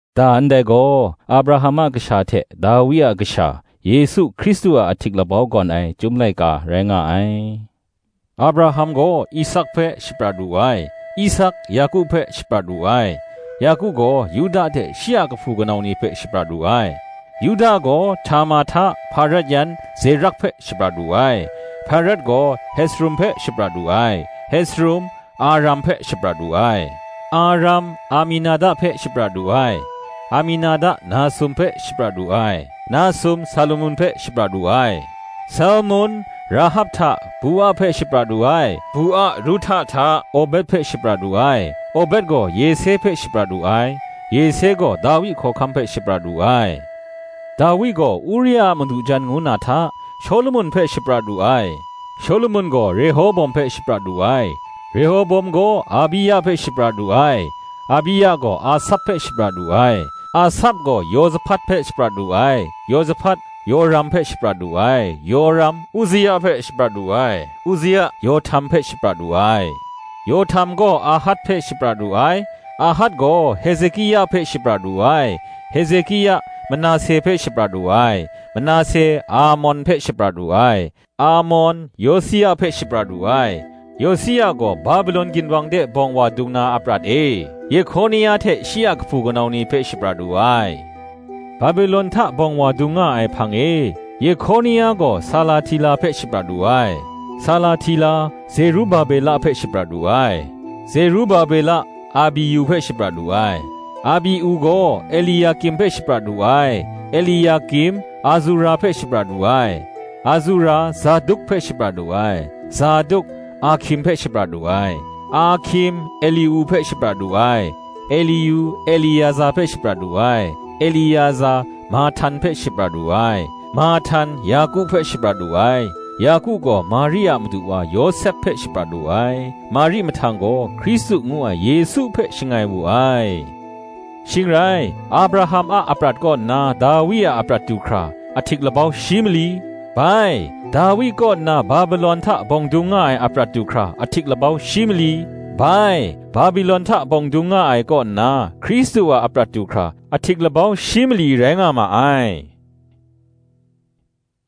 Da ndai gaw Abraham a kasha hte Dawi a kasha, Yesu Hkristu a ahtik labau gawn ai Chyum laika rai nga ai. Abraham gaw Isak hpe shaprat wu ai; Isak, Yaku hpe shaprat wu ai; Yaku gaw Yuda hte shi a kahpu kanau ni hpe shaprat wu ai; Yuda gaw, Htama hta, Hparet yan Zerak hpe shaprat wu ai; Hparet gaw Hesrum hpe shaprat wu ai; Hesrum, Aram hpe shaprat wu ai; Aram, Aminada hpe shaprat wu ai; Aminada, Nasun hpe shaprat wu ai; Nasun, Salmun hpe shaprat wu ai; Salmun, Rahab hta, Bua hpe shaprat wu ai; Bua, Ruhta hta, Obed hpe shaprat wu ai; Obed gaw Yese hpe shaprat wu ai; Yese gaw Dawi hkawhkam hpe shaprat wu ai; Dawi gaw Uria a madu jan ngu na hta, Shawlumon hpe shaprat wu ai; Shawlumon gaw Rehoboam hpe shaprat wu ai; Rehoboam gaw Abia hpe shaprat wu ai; Abia gaw Asap hpe shaprat wu ai; Asap gaw Yosahpat hpe shaprat wu ai; Yosahpat, Yoram hpe shaprat wu ai; Yoram, Uzia hpe shaprat wu ai; Uzia, Yohtam hpe shaprat wu ai; Yohtam gaw Ahat hpe shaprat wu ai; Ahat gaw Hezekia hpe shaprat wu ai; Hezekia, Manase hpe shaprat wu ai; Manase, Amon hpe shaprat wu ai; Amon, Yosia hpe shaprat wu ai; Yosia gaw Babelon ginwang de bawng wa dung na aprat e, Yehkonia hte shi a kahpu kanau ni hpe shaprat wu ai; Babelon hta bawng wa dung nga ai hpang e, Yehkonia gaw Salahtila hpe shaprat wu ai, Salahtila, Zerubabela hpe shaprat wu ai; Zerubabela, Abiu hpe shaprat wu ai; Abiu gaw Eliakim hpe shaprat wu ai; Eliakim, Azura hpe shaprat wu ai; Azura, Zaduk hpe shaprat wu ai; Zaduk, Ahkim hpe shaprat wu ai; Ahkim, Eliu hpe shaprat wu ai; Eliu, Eliaza hpe shaprat wu ai; Eliaza, Mahtan hpe shaprat wu ai; Mahtan, Yaku hpe shaprat wu ai; Yaku gaw Mari a madu wa Yawsep hpe shaprat wu ai; Mari mahtang gaw, Hkristu ngu ai Yesu hpe shangai wu ai; Shing rai, Abraham a aprat kaw nna Dawi a aprat du hkra, ahtik labau shi mali; bai, Dawi kaw nna Babelon hta bawng dung nga ai aprat du hkra, ahtik labau shi mali; bai, Babelon hta bawng dung nga ai kaw nna, Hkristu a aprat du hkra, ahtik labau shi mali li rai nga ma ai.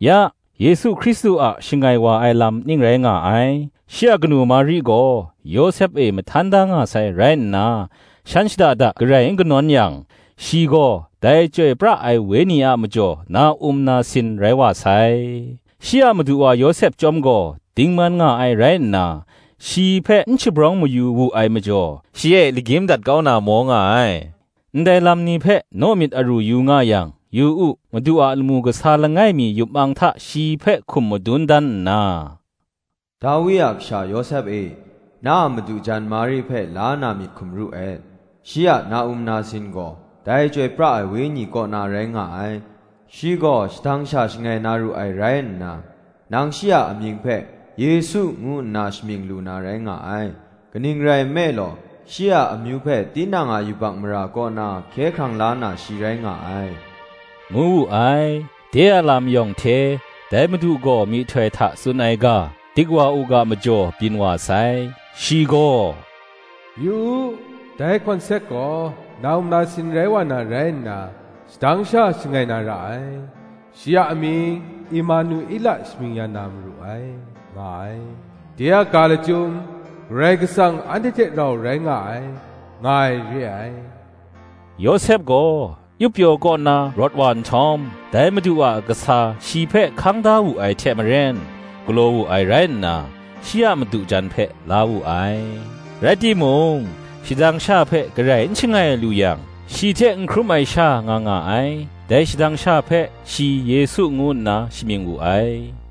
Ya, Yesu Hkristu a shangai wa ai lam ning rai nga ai: Shi a kanu Mari gaw, Yawsep e mahtan da nga sai rai nna, shan shada da garai n kanawn yang, shi gaw dai Chyoi pra ai Wenyi a majaw na-um nasin rai wa sai. Shi a madu wa Yawsep chyawm gaw, dingman nga ai rai nna, shi hpe n shabrawng mayu wu ai majaw, shi e lagyim dat kau na maw nga ai. Ndai lam ni hpe naw myit aru nga yang, yu u, Madu a lamu kasa langai mi yup mang hta shi hpe hkum madun dan nna, “Dawi a kasha Yawsep e, na a madu jan Mari hpe la na myit hkum ru et; shi a na-um nasin gaw, dai Chyoi pra ai Wenyi kaw na rai nga ai: Shi gaw shadang sha shangai na ru ai rai nna, nang shi a amying hpe, Yesu ngu nna shamying lu na rai nga ai: kaning rai nme law, shi a amyu hpe tinang a yubak mara kaw na hkye hkrang la na shi rai nga ai,” ngu wu ai. De a lam yawng hte, dai Madu gaw myihtoi hta tsun ai ga dik wa u ga majaw byin wa sai. Shi gaw, “Yu u, dai hkawnsek gaw na-um nasin rai wa na rai nna, shadang sha shangai na ra ai, Shi a amying, Emanuela shamying ya na maru ai,” nga ai: de a ga lachyum, “Karai Kasang anhte hte rau rai nga ai,” nga ai re ai. Yawsep gaw, yup pyaw kaw na rawt wa nhtawm, dai Madu a kasa shi hpe hkang da wu ai hte maren, galaw wu ai rai nna, shi a madu jan hpe la wu ai: rai timung, shadang sha hpe garai n shangai lu yang, shi hte n hkrum ai sha nga nga ai: dai shadang sha hpe, shi Yesu ngu nna shamying wu ai.